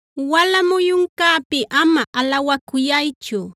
Wala muyuncäpi ama alawacuyaychu;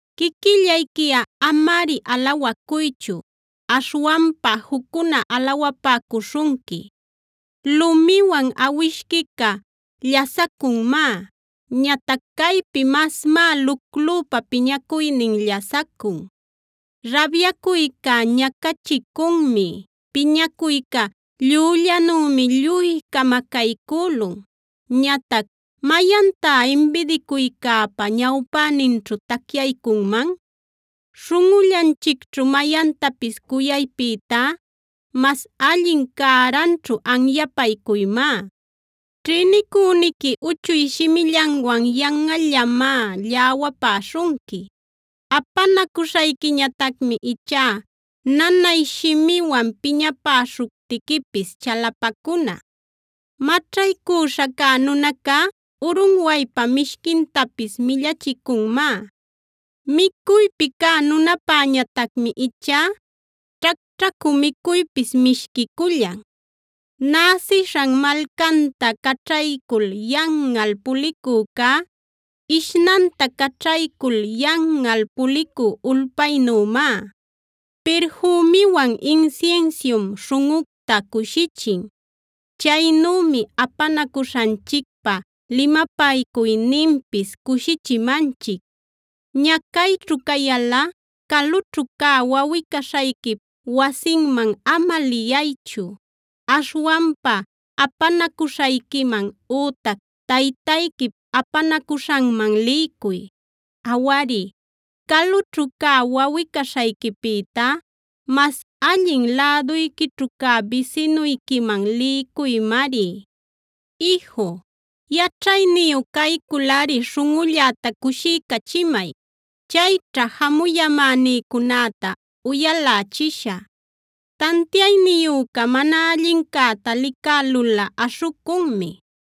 Quiquillayquiꞌa amari alawacuychu; aśhwanpa juccuna alawapäcuśhunqui. Lumiwan awishquica llasacunmá; ñatac caypi masmá luclüpa piñacuynin llasacun. Rabyacuyca ñacachicunmi; piñacuyca llüllanümi lluy camacaycülun; ñatac ¿mayantá imbidicuycäpa ñawpäninćhu tacyaycunman? Śhunꞌullanchicćhu mayantapis cuyaypïtá mas allin cäranćhu anyapaycuymá. Ćhïnicüniqui uchuy shimillanwan yanꞌallamá lläwapäśhunqui. Apanacuśhayquiñatacmi ichá nanay shimiwan piñapäśhuptiquipis chalapacuna. Maćhaycüśha cä nunacá urunwaypa mishquintapis millachicunmá; micuypi cä nunäpäñatacmi ichá ćhacćhacü micuypis mishquicullan. Näsishan malcanta caćhaycul yanꞌal pulicücá, ishnanta caćhaycul yanꞌal pulicü ulpaynümá. Pirfümiwan insinsium śhunꞌucta cushichin; chaynümi apanacuśhanchicpa limapaycuyninpis cushichimanchic. Ñacayćhu cayalꞌa calućhu cä wawꞌi-caśhayquip wasinman ama liyaychu. Aśhwanpa apanacuśhayquiman ütac taytayquip apanacuśhanman liycuy. Awari, calućhu cä wawꞌi-caśhayquipïtá mas allin läduyquićhu cä bisinuyquiman liycuymari. Iju, yaćhayniyu cayculꞌari śhunꞌulläta cushiycachimay. Chayćha jamuyamänïcunäta uyalächishä. Tantiayniyüca mana allincäta licälulꞌa aśhucunmi.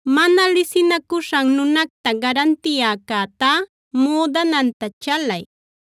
Mana lisinacuśhan nunacta garantiyäcätá, müdananta chalay;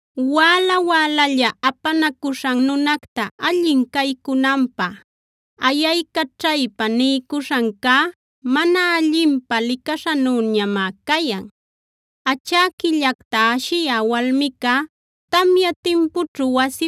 Wäla wälalla apanacuśhan nunacta allin caycunanpä ayaycaćhaypa niycuśhancá, mana allinpä licaśhanüñamá cayan. Achäquillacta ashiyä walmica tamya timpućhu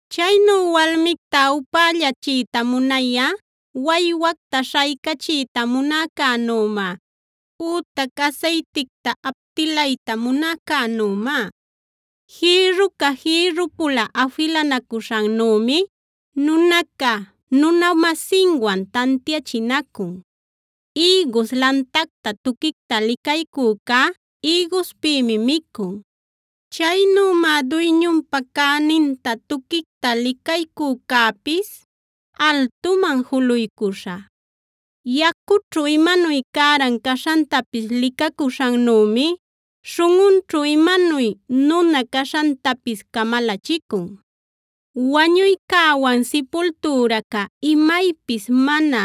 Chaynu walmicta upällachiyta munayꞌa waywacta śhaycachiyta munäcänümá ütac asayticta aptilayta munäcänümá. Jïrruca jïrrupula afilanacuśhannümi, nunaca nuna-masinwan tantiachinacun. Ïgus lantacta tuquicta licaycücá, ïguspïmi micun; chaynümá duyñunpa cäninta tuquicta licaycücäpis altuman juluycuśha. Yacućhu imanuy cäran caśhantapis licacuśhannümi śhunꞌunćhu imanuy nuna caśhantapis camalachicun. Wañuycäwan sipultüraca imaypis mana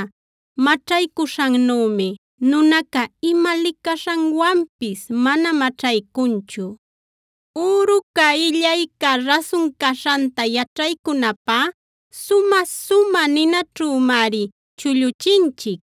maćhaycuśhannümi nunaca ima licaśhanwanpis mana maćhaycunchu. Üruca, illayca rasun caśhanta yaćhaycunapä sumä-sumä ninaćhümari chulluchinchic.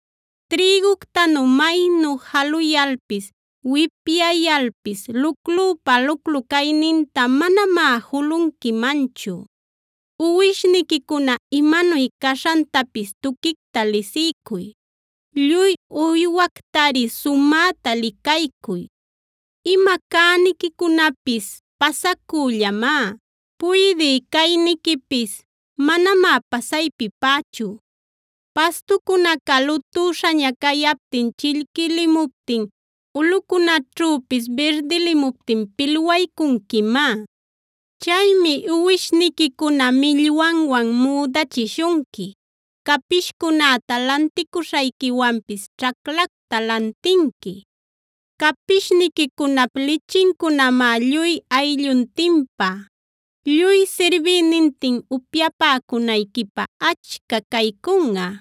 Trïguctanu maynu jaluyalpis, wipyayalpis luclüpa luclu cayninta manamá julunquimanchu. Uwishniquicuna imanuy caśhantapis tuquicta lisiycuy; lluy uywactari sumäta licaycuy. Ima cäniquicunapis pasacüllamá; puydï cayniquipisf manamá pasaypipächu. Pastucunaca lutüśhaña cayaptin, chillquilimuptin, ulꞌucunäćhüpis birdilimuptin pilwaycunquimá. Chaymi uwishniquicuna millwanwan müdachishunqui; capishcunäta lanticuśhayquiwanpis ćhaclacta lantinqui. Capishniquicunap lichincunamá lluy aylluntinpä, lluy sirbïnintin upyapäcunayquipä achca caycunꞌa.